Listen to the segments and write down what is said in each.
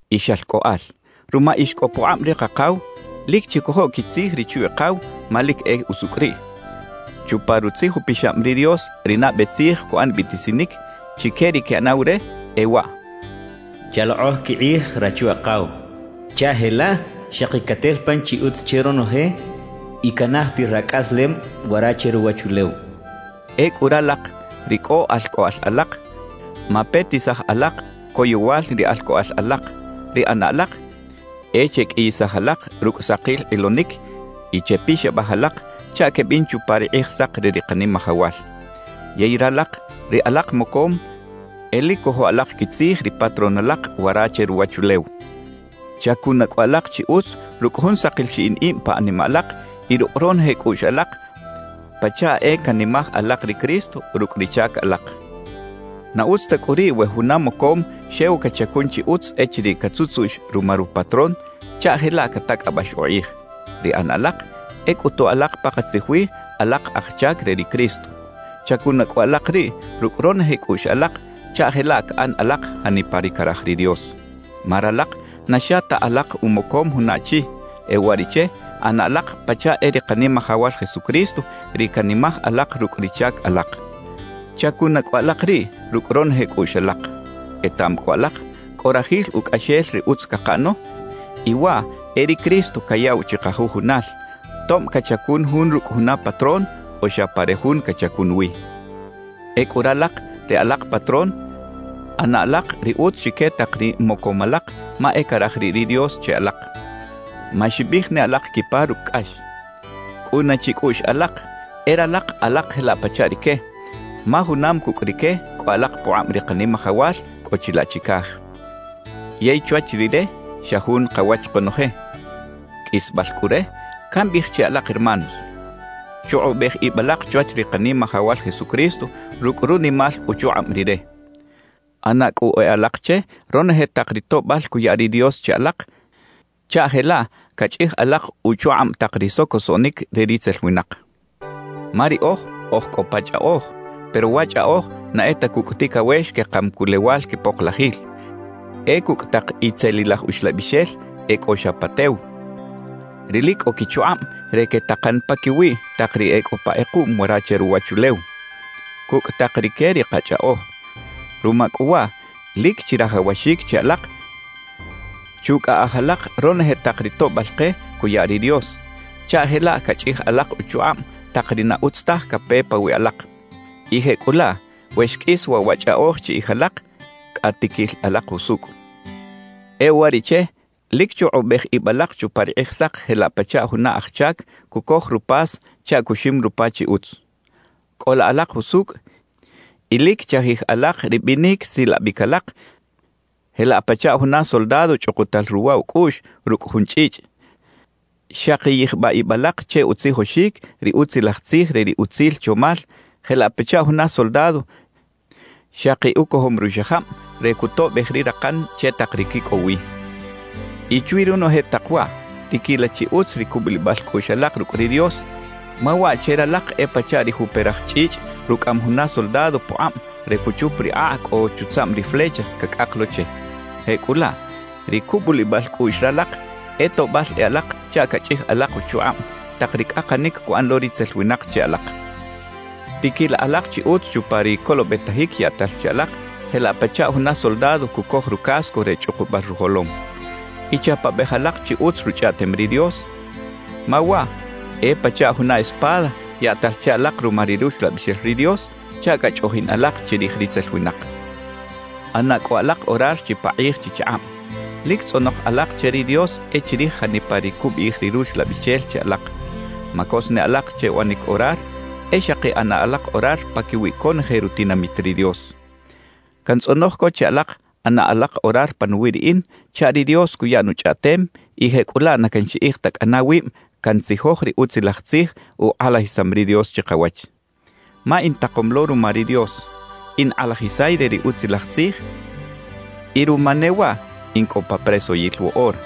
Ix alcꞌoꞌal, ruma ix cꞌo pukꞌab ri Kakaw, lic chicojo quitzij richu-ikaw ma lic e usucꞌ riꞌ. Chupa Rutzij Upixab ri Dios ri nabe tzij cuꞌan biꞌtisinic chique ri queꞌanaw re, e waꞌ: Chalokꞌoj quikꞌij rachu-akaw, chaꞌ jelaꞌ xaki catel pan chi utz che ronoje y canajtir racꞌaslem wara che ruwachulew. Ecꞌu ralak ri cꞌo alcꞌoꞌal alak, mapetisaj alak coyowal ri alcꞌoꞌal alak; ri ꞌana alak e cheqꞌuiyisaj alak rucꞌ sakil kꞌilonic y chepixabaj alak chaꞌ quebin chupa ri Kꞌijsak re ri Kanimajawal. Yey ralak ri alak mocom, e lic cojo alak quitzij ri patrón alak wara che ruwachulew. Chacuna cꞌu alak chi utz rucꞌ jun sakil xiꞌin ib pa animaꞌ alak y rucꞌ ronoje cꞌuꞌx alak pachaꞌ e canimaj alak ri Cristo rucꞌ ri chac alak. Na utz ta cꞌu riꞌ we juna mocom xew cachacun chi utz echiriꞌ catzutzuꞌx ruma rupatrón chaꞌ jelaꞌ catacꞌabax ukꞌij. Ri ꞌana alak e cꞌutu alak pakatzij wi alak aj chac re ri Cristo. Chacuna cꞌu alak riꞌ rucꞌ ronoje cꞌuꞌx alak chaꞌ jelaꞌ caꞌan alak janipa ri caraj ri Dios. Ma ralak na xa ta alak umocom juna achi; e uwariꞌche, ꞌana alak pachaꞌ e ri Kanimajawal Jesucristo ri canimaj alak rucꞌ ri chac alak. Chacuna cꞌu alak riꞌ rucꞌ ronoje cꞌuꞌx alak. Etaꞌam cꞌu alak cꞌo rajil ucꞌaxel ri utz cakaꞌano y waꞌ e ri Cristo cayaꞌw chikajujunal, tob cachacun jun rucꞌ juna patrón o xa pa re jun cachacun wi. Ecꞌu ralak ri alak patrón, ꞌana alak ri utz chique tak ri mocom alak ma e caraj riꞌ ri Dios che alak. Maxibij ne alak quipa rucꞌ cꞌax. Cꞌuna chicꞌuꞌx alak, e ralak alak jelaꞌ pachaꞌ rique, ma junam cucꞌ rique cꞌo alak pukꞌab ri Kanimajawal cꞌo chilaꞌ chicaj. Yey chwach Rire xa jun kawach konoje. Qꞌuisbal cꞌu re, cambiꞌij che alak hermanos, chukꞌubej ib alak chwach ri Kanimajawal Jesucristo rucꞌ runimal uchukꞌab Rire. ꞌAna cꞌu e alak che ronoje tak ri toꞌbal cuya ri Dios che alak chaꞌ jelaꞌ cachꞌij alak uchukꞌab tak ri socosoꞌnic re ritzel winak. Ma riꞌoj oj cꞌo pa chꞌaꞌoj. Pero wa chꞌaꞌoj na e ta cucꞌ ticawex quekam culewal quipoklajil, e cucꞌ tak itzelilaj uxlabixel e cꞌo xa pa tew, ri lic cꞌo quichukꞌab re quetakan paquiwi tak ri e cꞌo pa kꞌekuꞌm wara che ruwachulew. Cucꞌ tak rique ri kachꞌaꞌoj. Ruma cꞌu waꞌ, lic chirajawaxic che alak chucꞌaꞌaj alak ronoje tak ri toꞌbal ke cuya ri Dios, chaꞌ jelaꞌ cachꞌij alak uchukꞌab tak ri na utz taj cape pawiꞌ alak. Y jecꞌulaꞌ, we xqꞌuis waꞌ wa chꞌaꞌoj chiꞌij alak, cꞌa tiquil alak jusucꞌ. E uwariꞌche lic chukꞌubej ib alak chupa ri Kꞌijsak jelaꞌ pachaꞌ juna aj chac cucoj rupas chaꞌ cuxim rupa chi utz. Cꞌola alak jusucꞌ y lic chajij alak ri binic silabic alak jelaꞌ pachaꞌ juna soldado chꞌukutal ruwa ucꞌuꞌx rucꞌ jun chꞌichꞌ. Xaki yijbaꞌ ib alak che utzijoxic ri Utzilaj Tzij re ri utzil chomal jelaꞌ pachaꞌ juna soldado xaki ucojom ruxajab re cutoꞌbej ri rakan che tak ri quicꞌow wi. Y chwi ronoje tak waꞌ, tiquila chi utz ri cubulibal cꞌuꞌx alak rucꞌ ri Dios, ma waꞌ che ralak e pachaꞌ ri juperaj chꞌichꞌ rucꞌaꞌam juna soldado pukꞌab re cuchup ri akꞌ cꞌo chutzaꞌm ri flechas cacꞌak lo che. Jecꞌulaꞌ ri cubulibal cꞌuꞌx ralak e toꞌbal e alak chaꞌ cachꞌij alak uchukꞌab tak ri cꞌakanic cuꞌan lo ritzel winak che alak. Tiquila alak chi utz chupa ri colobetajic yaꞌtal che alak jelaꞌ pachaꞌ juna soldado cucoj rucasco re chꞌukubal rujolom. Y chapabej alak chi utz Ruchꞌaꞌtem ri Dios, ma waꞌ e pachaꞌ juna espada yaꞌtal che alak ruma ri Ruxlabixel ri Dios chaꞌ cachꞌoꞌjin alak chirij ritzel winak. ꞌAna cꞌu alak orar chipakꞌij chichakꞌab. Lic tzꞌonoj alak che ri Dios e chirij janipa ri cubiꞌij ri Ruxlabixel che alak. Macos ne alak che uꞌanic orar; e xaki ꞌana alak orar paquiwi conoje rutinamit ri Dios. Cantzꞌonoj co che alak ꞌana alak orar panuwi riꞌin chaꞌ ri Dios cuya nuchꞌaꞌtem y jecꞌulaꞌ na canxiꞌij ta cꞌana wib cantzijoj ri Utzilaj Tzij ukꞌalajisam ri Dios chikawach. Ma intakom lo ruma ri Dios, in kꞌalajisay re ri Utzilaj Tzij y ruma ne waꞌ in cꞌo pa presoyil woꞌora.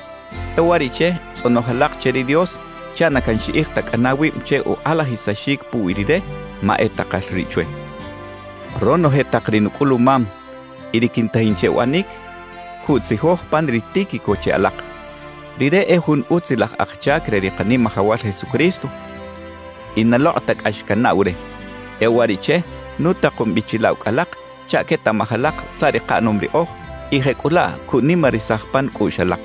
E uwariꞌche tzꞌonoj alak che ri Dios chaꞌ na canxiꞌij ta cꞌana wib che ukꞌalajisaxic puwi Rire, ma e takal riꞌ chwe. Ronoje tak ri nucꞌulumam y ri quintajin che uꞌanic, cuꞌtzijoj pan ri Tíquico che alak. Rire e jun utzilaj aj chac re ri Kanimajawal Jesucristo y na lokꞌ ta cꞌax canaꞌw re. E uwariꞌche nutakom bi chilaꞌ ucꞌ alak chaꞌ quetaꞌmaj alak saꞌ ri kaꞌanom riꞌoj y jecꞌulaꞌ cuꞌnimarisaj pan cꞌuꞌx alak.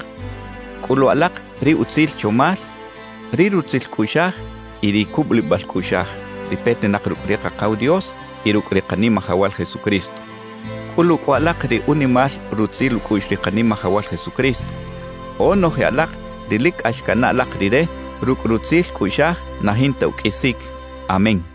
Cꞌulu alak ri utzil chomal, ri rutzil cꞌuꞌxaj y ri cubulibal cꞌuꞌxaj, ri petinak rucꞌ ri Kakaw Dios y rucꞌ ri Kanimajawal Jesucristo. Cꞌulu cꞌu alak ri unimal rutzil ucꞌuꞌx ri Kanimajawal Jesucristo, onoje alak ri lic cꞌax canaꞌ alak Rire rucꞌ rutzil cꞌuꞌxaj na jinta uqꞌuisic. Amén.